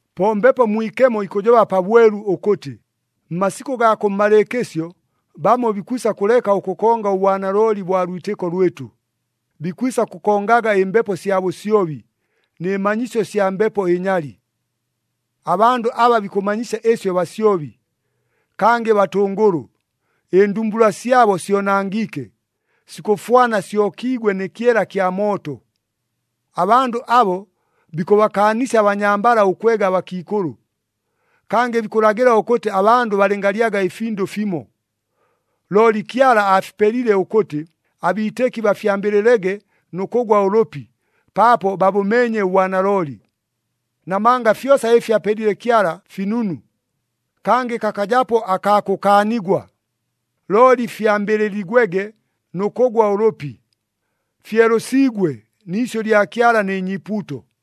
Po Mbepo Mwikemo ikʉjoba pabwelu ʉkʉtɨ, mmasikʉ gaa kʉmmalɨɨkɨsyo bamo bikwisa kʉleka ʉkʉkonga ʉbwanalooli bwa lwitɨko lwɨtʉ, bikwisa kʉkongaga ɨmbepo sya bʉsyobi, nɨ manyisyo sya mbepo ɨnyali. Abandʉ aba bikʉmanyisya ɨsyo basyobi, kangɨ batʉngʉlʉ, ɨndumbula syabo syonangiike, sikʉfwana syokiigwe nɨ kyela kya mooto. Abandʉ abo bikʉbakaanisya abanyambala ʉkwega abakiikʉlʉ. Kangɨ bikʉlagɨla ʉkʉtɨ abandʉ balɨngalyaga ɨfindʉ fimo. Looli Kyala aafipelile ʉkʉtɨ, abiitɨki bafyambɨlɨlege nʉ kʉgwa ʉlʉpi, paapo babʉmeenye ʉbwanalooli. Namanga fyosa ɨfi apelile Kyala finunu, kangɨ kakajapo akaa kʉkaanigwa, looli fyambɨlɨligwege nʉ kʉgwa ʉlʉpi. Fyelʉsiigwe ni isyʉ lya Kyala nɨ nyiipuuto.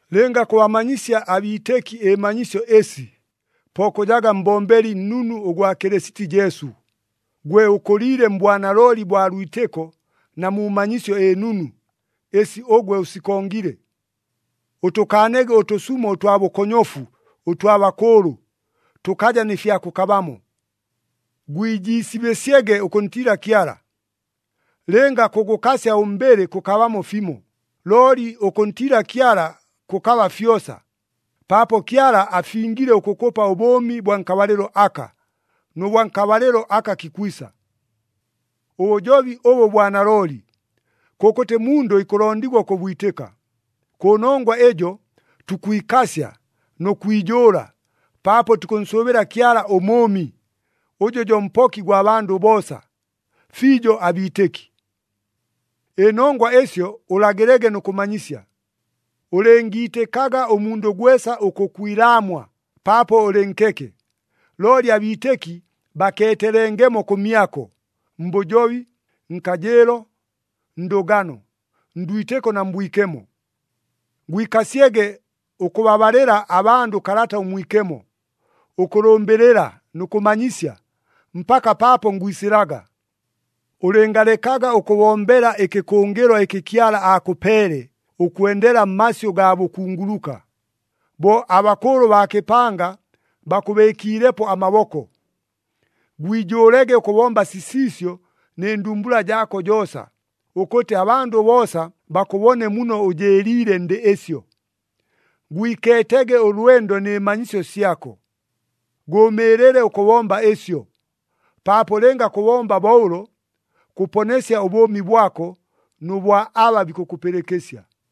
Lɨnga kʉbamanyisya abiitɨki ɨmanyisyo ɨsi, po kʉjaga mbombeli nnunu ʉgwa Kɨlɨsiti Jesu, gwe ʉkʉliile mbwanalooli bwa lwitɨko na mu manyisyo ɨnunu, ɨsi ʉgwe ʉsikongile. Ʉtʉkaanege ʉtʉsumo ʉtwa bʉkonyofu ʉtwa bakʉʉlʉ, tʉkaja nɨ fya kʉkabamo. Gwijiisibɨsyege ʉkʉntiila Kyala. Lɨnga kʉgʉkasya ʉmbɨlɨ kʉkabamo fimo, looli ʉkʉntiila Kyala kʉkaba fyosa, paapo Kyala afingile ʉkʉkʉpa ʉbʉʉmi bwa nkabalɨlo aka, nʉ bwa nkabalɨlo aka kikwisa. Ʉbʉjobi ʉbʉ bwa nalooli, kʉkʉtɨ mundʉ ikʉlondigwa ʉkʉbwitɨka. Kʉnongwa ɨjo tukwikasya nʉ kwijʉʉla, paapo tukʉnsʉʉbɨla Kyala ʉMʉʉmi, ʉjʉ jo Mpoki gwa bandʉ boosa, fiijo abiitɨki. Ɨnongwa ɨsyo ʉlagɨlege nʉ kʉmanyisya. Ʉlɨngiitɨkaga ʉmundʉ gwesa ʉkʉkwilaamwa paapo ʉlɨ nkeke. Looli abiitɨki bakeetelengemo kʉmyako, mbʉjobi, nkajɨɨlo, ndʉgano, ndwitɨko na mbwikemo. Gwikasyege ʉkʉbabalɨla abandʉ Kalata ʉMwikemo, ʉkʉlʉmbɨlɨla nʉ kʉmanyisya, mpaka paapo ngwisɨlaga. Ʉlɨngalekaga ʉkʉbombela ɨkɨkʉngɨlwa ɨkɨ Kyala aakʉpeele ʉkwendela mmasyʉ gaa bʉkunguluka, bo abakʉʉlʉ baa kɨpanga bakʉbɨɨkiilepo amaboko. Gwijʉʉlege ʉkʉbomba sisiisyo nɨ ndumbula jaako joosa, ʉkʉtɨ abandʉ boosa bakʉbone muno ʉjɨɨliile ndɨ ɨsyo. Gwikeetege ʉlwendo nɨ manyisyo syako. Gʉʉmɨɨlɨle ʉkʉbomba ɨsyo, paapo lɨnga kʉbomba bo ʉlo, kʉponesya ʉbʉʉmi bwako nʉ bwa aba bikʉkʉpɨlɨkɨsya.